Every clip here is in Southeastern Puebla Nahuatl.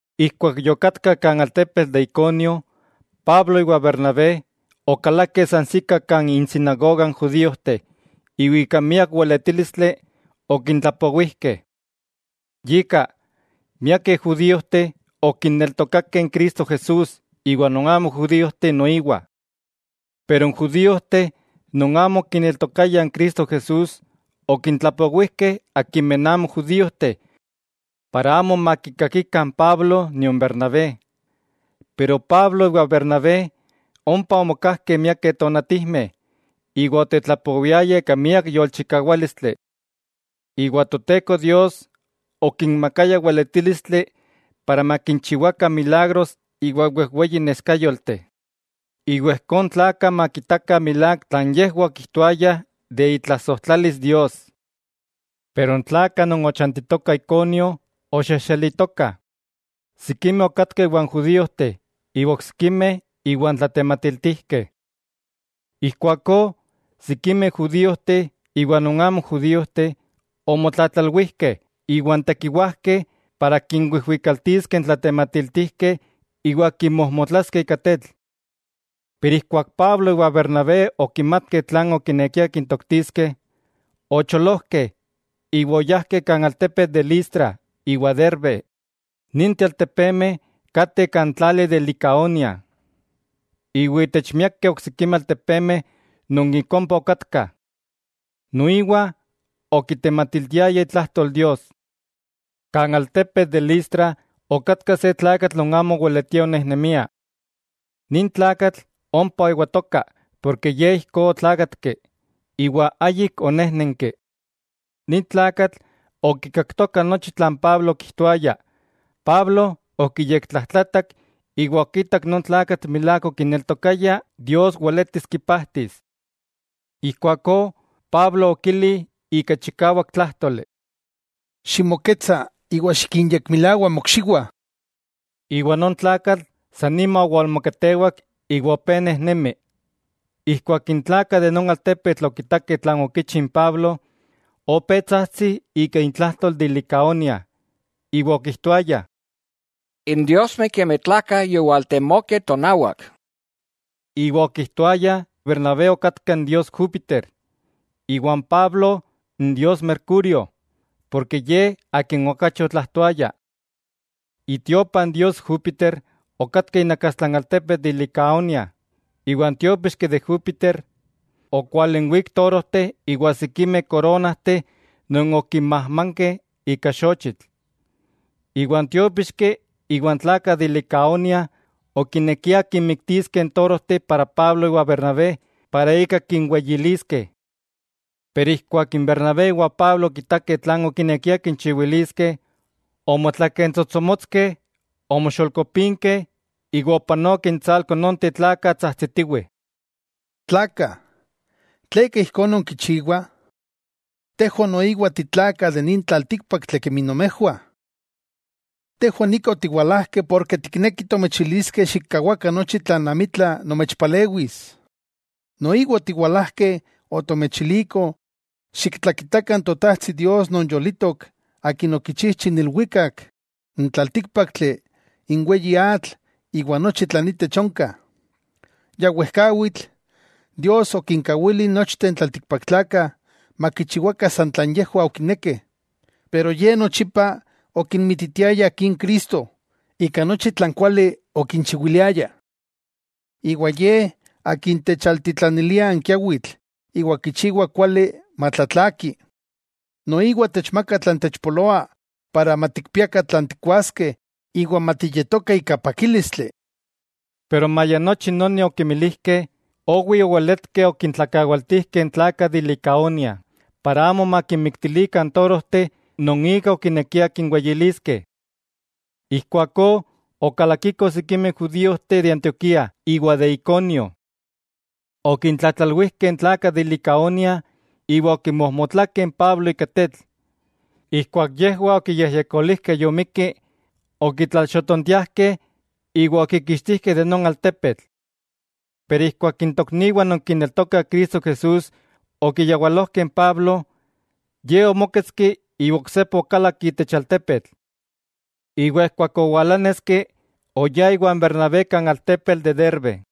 Ijkuak yokatkah kan altepetl de Iconio, Pablo iwa Bernabé okalakeh sansikah kan insinagoga n judíojteh iwa ika miak weletílistli okintlapowijkeh. Yika, miakeh judíojteh okineltokakeh Cristo Jesús iwa non amo judíojteh noiwa. Pero n judíojteh non amo okineltokayah Cristo Jesús, okintlatlapowijkeh akimeh amo judíojteh para amo makikakikah n Pablo nion Bernabé. Pero Pablo iwa Bernabé ompa omokajkeh miakeh tonatijmeh iwa otetlapowiayah ika miak yolchikawálistli. Iwa Toteko Dios okinmakaya weletílistli para makinchiwakah milagros iwa wejweyi neskayolteh, iwa ijkó n tlakah makitakah milák tlan yejwah okijtoayah de itlasojtlalis Dios. Pero n tlakah non ochantitokah Iconio oxexelitokah, sikimeh okatkah iwan judíojteh iwa oksikimeh iwan tlatematiltijkeh. Ijkuakó sikimeh judíojteh iwa non amo judíojteh, omotlatlalwijkeh iwan tekiwajkeh para kinwijwikaltiskeh n tlatematiltijkeh iwa kinmojmotlaskeh ika tetl. Pero ijkuak Pablo iwan Bernabé okimatkeh tlan okinekiah kintoktiskeh, ocholojkeh iwa oyajkeh kan altepetl de Listra iwa Derbe, ninteh altepemeh kateh kan tlali de Licaonia. Iwa itech miakeh oksikimeh altepemeh non ik ompa okatkah, noiwa okitematiltiayah itlajtol Dios. Kan altepetl de Listra okatka se tlakatl non amo oweletia onejnemia. Nin tlakatl ompa oewatoka porke ye ijkó otlákatki, iwa ayik onéjnenki. Nin tlakatl okikaktoka nochi tlan Pablo okijtoaya, Pablo okiyektlajtlatak iwa okitak non tlakatl milák okineltokaya Dios weletis kipajtis. Ijkuakó Pablo okili ika chikawak tlájtoli: —Ximoketsa iwa xikinyekmilawa mokxiwah. Iwa non tlakatl san nima owalmoketewak iwa opé nejnemi. Ijkuak n tlakah de non altepetl okitakeh tlan okichi n Pablo, opé tsajtsih ika intlajtol de Licaonia, iwa okijtoayah: —¡N diosmeh kemi tlakah yowaltemokeh tonawak! Iwa okijtoayah Bernabé okatka n dios Júpiter, iwa n Pablo n dios Mercurio, porke ye akin okachi otlajtoaya. Itiopa n dios Júpiter okatka inakastla n altepetl de Licaonia, iwa n tiópixki de Júpiter okualinwík torojteh iwa sikimeh koronajteh non okinmajmankeh ika xochitl. Iwa n tiópixki iwa n tlakah de Licaonia okinekiah kinmiktiskeh torojteh para Pablo iwa Bernabé para ika kinweyiliskeh. Pero ijkuak n Bernabé iwa Pablo okitakeh tlan okinekiah kinchiwiliskeh, omotlakentsotsomotskeh, omoxolkopinkeh iwa opanokeh intsalko nonteh tlakah tsajtsitiwih: —¡Tlakah! ¿Tleka ijkó nonkichiwah? Tejwah noiwa titlakah de nin tlaltíkpaktli kemi nomejwah. Tejwah nika otiwalajkeh porke tiknekih tomechiliskeh xikkawakah nochi ni tlan amitla nomechpalewis, noiwa otiwalajkeh otomechilikoh xiktlakitakah n Totajtsi Dios non yolitok akin okichijchi n ilwikak, n tlaltíkpaktli, n weyi atl iwa nochi tlan itech onka. Ya wejkawitl, Dios okinkawili nochteh n tlaltikpaktlakah makichiwakah san tlan yejwah okinekeh. Pero Ye nochipa okimititiaya Akin Cristo ika nochi tlan kuali okinchiwiliaya. Iwa Ye Akin techaltitlanilia n kiawitl iwa kichiwa kuali matlatlaki, noiwa techmaka tlan techpoloa para matikpiakah tlan tikkuaskeh iwa matiyetokah ika pakílistli. Pero maya nochi noni okimilijkeh, owi oweletkeh okintlakawaltijkeh n tlakah de Licaonia para amo makinmiktilikah torojteh non ika okinekiah kinweyiliskeh. Ijkuakó okalakikoh sikimeh judíojteh de Antioquía iwa de Iconio. Okintlatlalwijkeh n tlakah de Licaonia, iwa okimojmotlakeh n Pablo ika tetl. Ijkuak yejwah okiyejyekolijkeh yomikki, okitlalxotontiajkeh iwa okikixtijkeh de non altepetl. Pero ijkuak n tokniwah non kineltokah Cristo Jesús okiyawalojkeh n Pablo, ye omóketski iwa oksepa okalak itech altepetl. Iwa ijkuak owalaneski oyá iwa Bernabé kan altepetl de Derbe.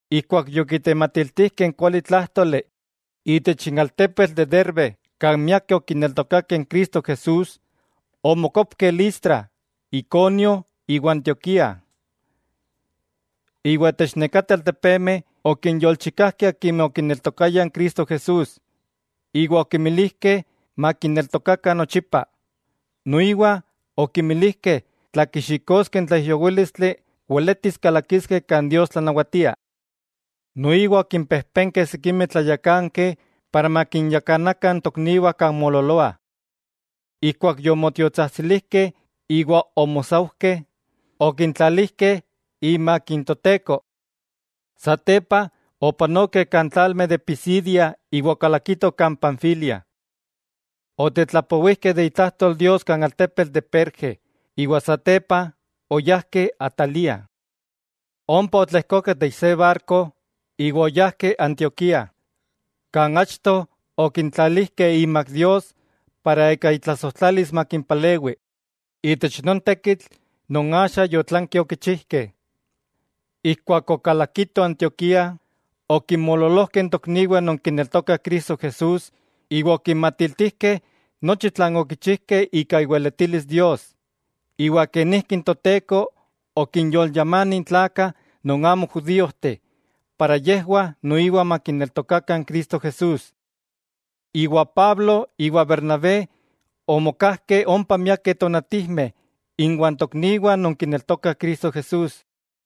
Ijkuak yokitematiltijkeh n kualitlájtoli itech n altepetl de Derbe kan miakeh okineltokakeh n Cristo Jesús, omokopkeh Listra, Iconio iwa Antioquía. Iwa itech nekateh altepemeh okinyolchikajkeh akimeh okineltokayah n Cristo Jesús, iwa okimilijkeh makineltokakah nochipa. Noiwa okinmilijkeh tla kixikoskeh n tlaijyowílistli weletis kalakiskeh kan Dios tlanawatia. Noiwa okimpejpenkeh sikimeh tlayakankeh makinyakanakah n tokniwah kan moololoah. Ijkuak yomotiotsajtsilijkeh iwa omosaujkeh, okintlalijkeh imak n Toteko. Satepa opanokeh kan tlalmeh de Pisidia iwa okalakitoh Panfilia. Otetlapowijkeh itlajtol Dios kan altepetl de Perge, iwa satepa oyajkeh Atalía. Ompa otlejkokeh itech se barko iwa oyajkeh Antioquía kan achto okintlalijkeh imak Dios para ika itlasojtlalis makimpalewi itech non tekitl non axa yotlankeh okichijkeh. Ijkuak okalakitoh Antioquía, okinmoololojkeh n tokniwah non kineltokah Cristo Jesús iwa okinmatiltijkeh nochi tlan okichijkeh ika iweletilis Dios, iwa kenijki n Toteko okinyolyamani n tlakah non amo judíojteh para yejwah noiwa makineltokakah n Cristo Jesús. Pablo iwa Bernabé omokajkeh ompa miakeh tonatijmeh inwah tokniwah non kineltokah Cristo Jesús.